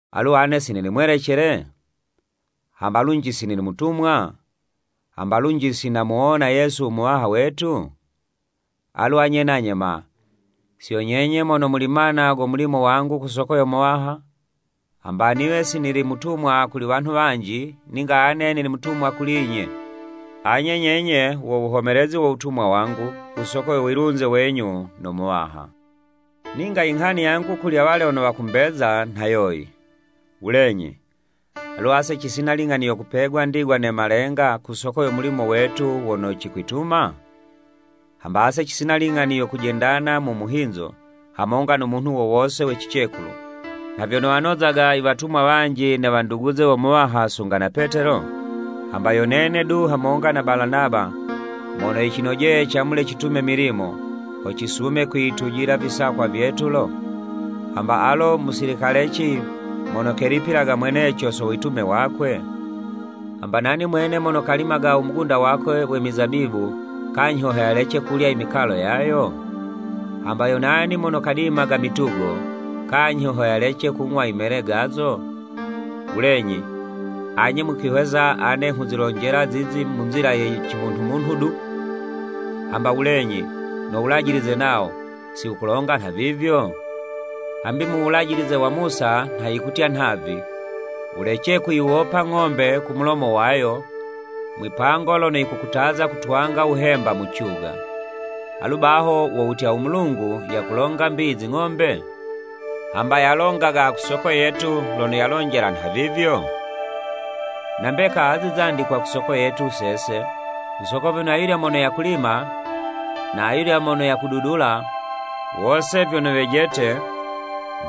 Alu ane si nili mwelecele? Hamba lunji si nili mutumwa? Hamba lunji si namuwona Yesu u Muwaha wetu? Alu anye nanye ma, si yo nyenye mono muli mana go mulimo wangu ku soko yo Muwaha? Hamba niwe si nili mutumwa kuli wanhu wanji, ninga ane nili mutumwa kuli'nye. Anye nyenye, wo wuhomelezi wo wutumwa wangu, ku soko yo wilunze wenyu no Muwaha. Ninga i nghani yangu kuli awalya wono wakumbeza nha yoyi, Wulenyi, alu ase cisina i ling'ani yo kupegwa ndigwa ne malenga ku soko yo mulimo wetu wono cikwituma? Hamba ase cisina ling'ani yo kujendana mu muhinzo, hamonga no munhu wo wose we cicekulu, nha vyono wanozaga i watumwa wanji ne wanduguze wo Muwaha sunga na Petelo? Hamba yo nene du hamonga na Balanaba, mono yicinojeye camule citume milimo, ho cisume kwiyitujila visakwa vyetu lo? Hamba alo musilikaleci mono kelipilaga mweneco so witume wakwe? Hamba nani mwene mono kalimaga u mugunda wakwe we mizabibu, kanyhi ho yalece kulya i mikalo yayo? Hamba yo nani mono kadimaga mitugo, kanyhi ho yalece kung'wa i mele gazo? Wulenyi, anye mukwihwesa ane nghuzilonjela zizi mu nzila ye cimunhumunhu du? Hamba wulenyi, no Wulajilize nawo, si wukulonga nhavivyo? Hambi mu Wulajilize wa Musa nha yikutya nhavi, “Wulece kuyiwopa ng'ombe ku mulomo wayo, mwipango lono yikukutaza kutwanga wuhemba mu cuga.” Alu baho wo wutya u Mulungu yakulonga 'mbi i zing'ombe? Hamba yalongaga ku soko yetu, lono yalonjela nhavivyo? Na mbeka azi zandikwa ku soko yetu sese, ku soko vyono ayulya mono yakulima, na ayulya mono yakududula, wose vyono wejete,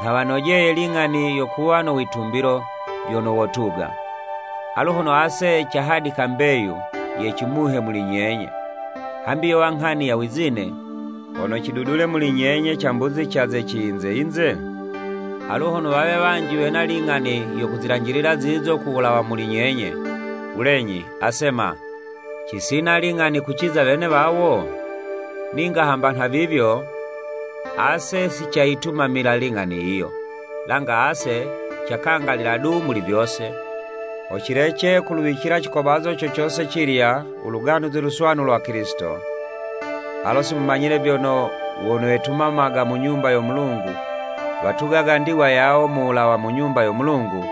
nha wanojeye ling'ani yo kuwa no witumbilo, vyono wotuga. Alu hono ase cahadika mbeyu ye cimuhe muli nyenye, hambi yowa nghani ya wizine, hono cidudule muli nyenye cambuzi ca ze ciyinze-yinze? Alu hono wawe wanji wena ling'ani yo kuzilanjilila zizo ku wulawa muli nyenye, wulenyi, ase ma, cisina ling'ani kuciza wene wawo? Ninga hamba nhavivyo, ase si cayitumamila ling'ani yiyo. Langa ase cakangalila du muli vyose, ho cilece kuluwicila cikobazo co cose cilya, u Luganuzi Luswanu lwa Kilisito. Alo si mumanyile vyono, wono wetumamaga mu Nyumba yo Mulungu, watugaga ndigwa yawo mu wulawa mu Nyumba yo Mulungu,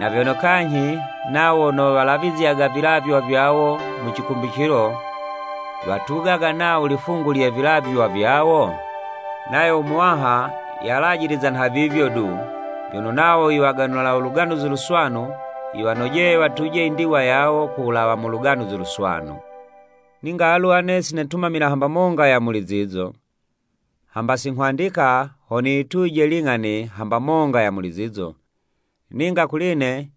na vyono kanyhi, nawo wono walavizyaga vilavywa vyawo mu cikumbicilo watugaga nawo lifungu lye vilavywa vivyo? Nayo u Muwaha yalajiliza nhavivyo du, vyono nawo i waganula u Luganuzi Luswanu, yiwanojeye watuje indigwa yawo ku wulawa mu Luganuzi Luswanu. Ninga alu ane si netumamila hamba monga ya muli zizo. Hamba si nghwandika ho niyituje ling'ani hamba monga ya muli zizo, ninga kuli'ne,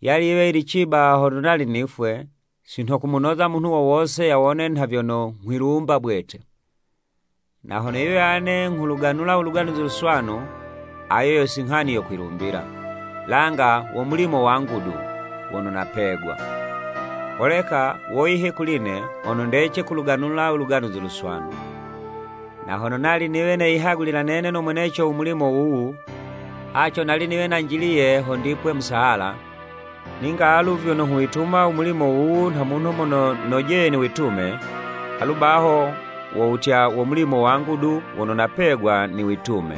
yali yiwe yili ciba hono nali nifwe, si nho kumunoza munhu wo wose yawone nha vyono nghwilumba bwete. Na hono yiwe ane nghuluganula u Luganuzi Luswanu, ayo yo si nghani yo kwilumbila, langa wo mulimo wangu du, wono napegwa. Holeka, woyi he kuli ne, hono ndece kuluganula Luganuzi Luswanu! Na hono nali niwe neyihagulila nene no mweneco u mulimo wuwu, haco nali niwe nanjiliye ho ndipwe musahala, ninga alu vyono nghuwituma u mulimo wuwu nha munhu mono nojeye niwitume, alu baho wo wutya, wo mulimo wangu du wono napegwa niwitume.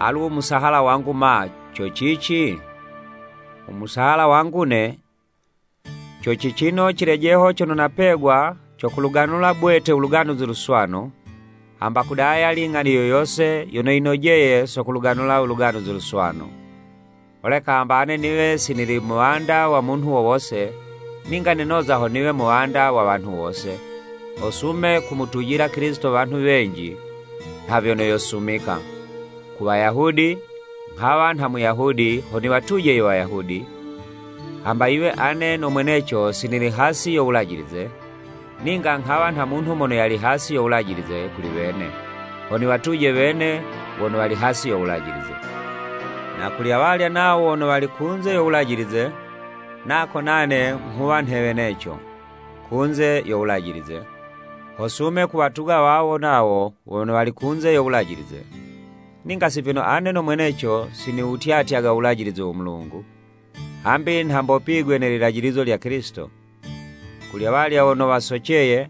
Alu u musahala wangu ma, co cici? U musahala wangu'ne, co cicino cilejeho cono napegwa co kuluganula bwete u Luganuzi Luswanu, hamba kudaya ling'ani yo yose yono yinojeye so kuluganula u Luganuzi Luswanu. Holeka hamba ane niwe si nili muwanda wa munhu wo wose, ninga nenoza ho niwe muwanda wa wanhu wose, ho sume kumutujila Kilisito wanhu wenji nha vyono yosumika. Ku Wayahudi, nghawa nha Muyahudi ho niwatuje i Wayahudi, hamba yiwe ane no mweneco si nili hasi yo Wulajilize, ninga nghawa nha munhu mono yali hasi yo Wulajilize kuli wene, ho niwatuje wene wono wali hasi yo Wulajilize. Na kuli awalya nawo wono wali kunze yo Wulajilize, nako nane nghuwa nhe weneco, kunze yo Wulajilize, ho sume kuwatuga wawo nawo wono wali kunze yo Wulajilize. Ninga si vyono ane no mweneco si niwutyatyaga u Wulajilize wo Mulungu, hambi nha mbopigwe ne lilajilizo lya Kilisito. Kuli awalya wono wasoceye,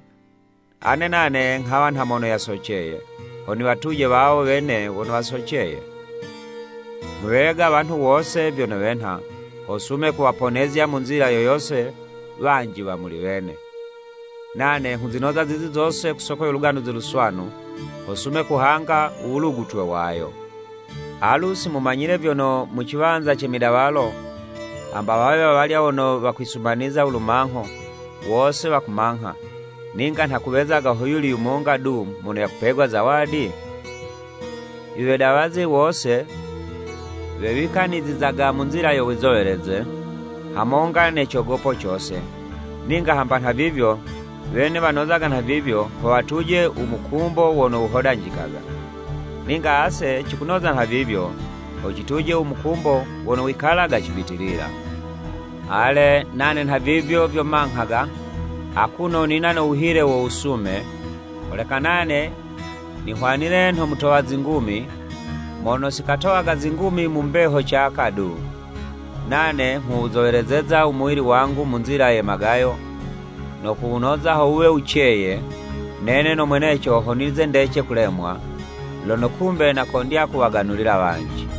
ane nane nghawa nha mono yasoceye, ho niwatuje wawo wene wono wasoceye. Nghuwega wanhu wose vyono wenha, ho sume kuwaponezya mu nzila yoyose wanji wa muli wene. Nane nghuzinoza zizi zose ku soko yo Luganuzi Luswanu, ho sume kuhanga u wulugutwe wayo. Alu si mumanyile vyono mu ciwanza ce midawalo, hamba wawe wawalya wono wakwisumaniza u lumangho, wose wakumangha, ninga hakuwezaga ho yuli yumonga du mono yakupegwa zawadi? I wedawazi wose, wewikanizizaga mu nzila yo wizoweleze, hamonga ne cogopo cose, ninga hamba nhavivyo, wene wanozaga nhavivyo, ho watuje u mukumbo wono wuhodanjikaga! Ninga ase cikunoza nhavivyo, ho cituje u mukumbo wono wikalaga cibitilila. Ale, nane nhavivyo vyo manghaga, akuno nina no wuhile wo wusume, holeka nane nihwanile nho mutowa zingumi, mono si katowaga zingumi mu mbeho caka du. Nane nghuwuzowelezeza u muwili wangu mu nzila ye magayo, no kuwunoza ho wuwe wuceye, nene no mweneco ho nize ndece kulemwa, lono kumbe nakondya kuwaganulila wanji.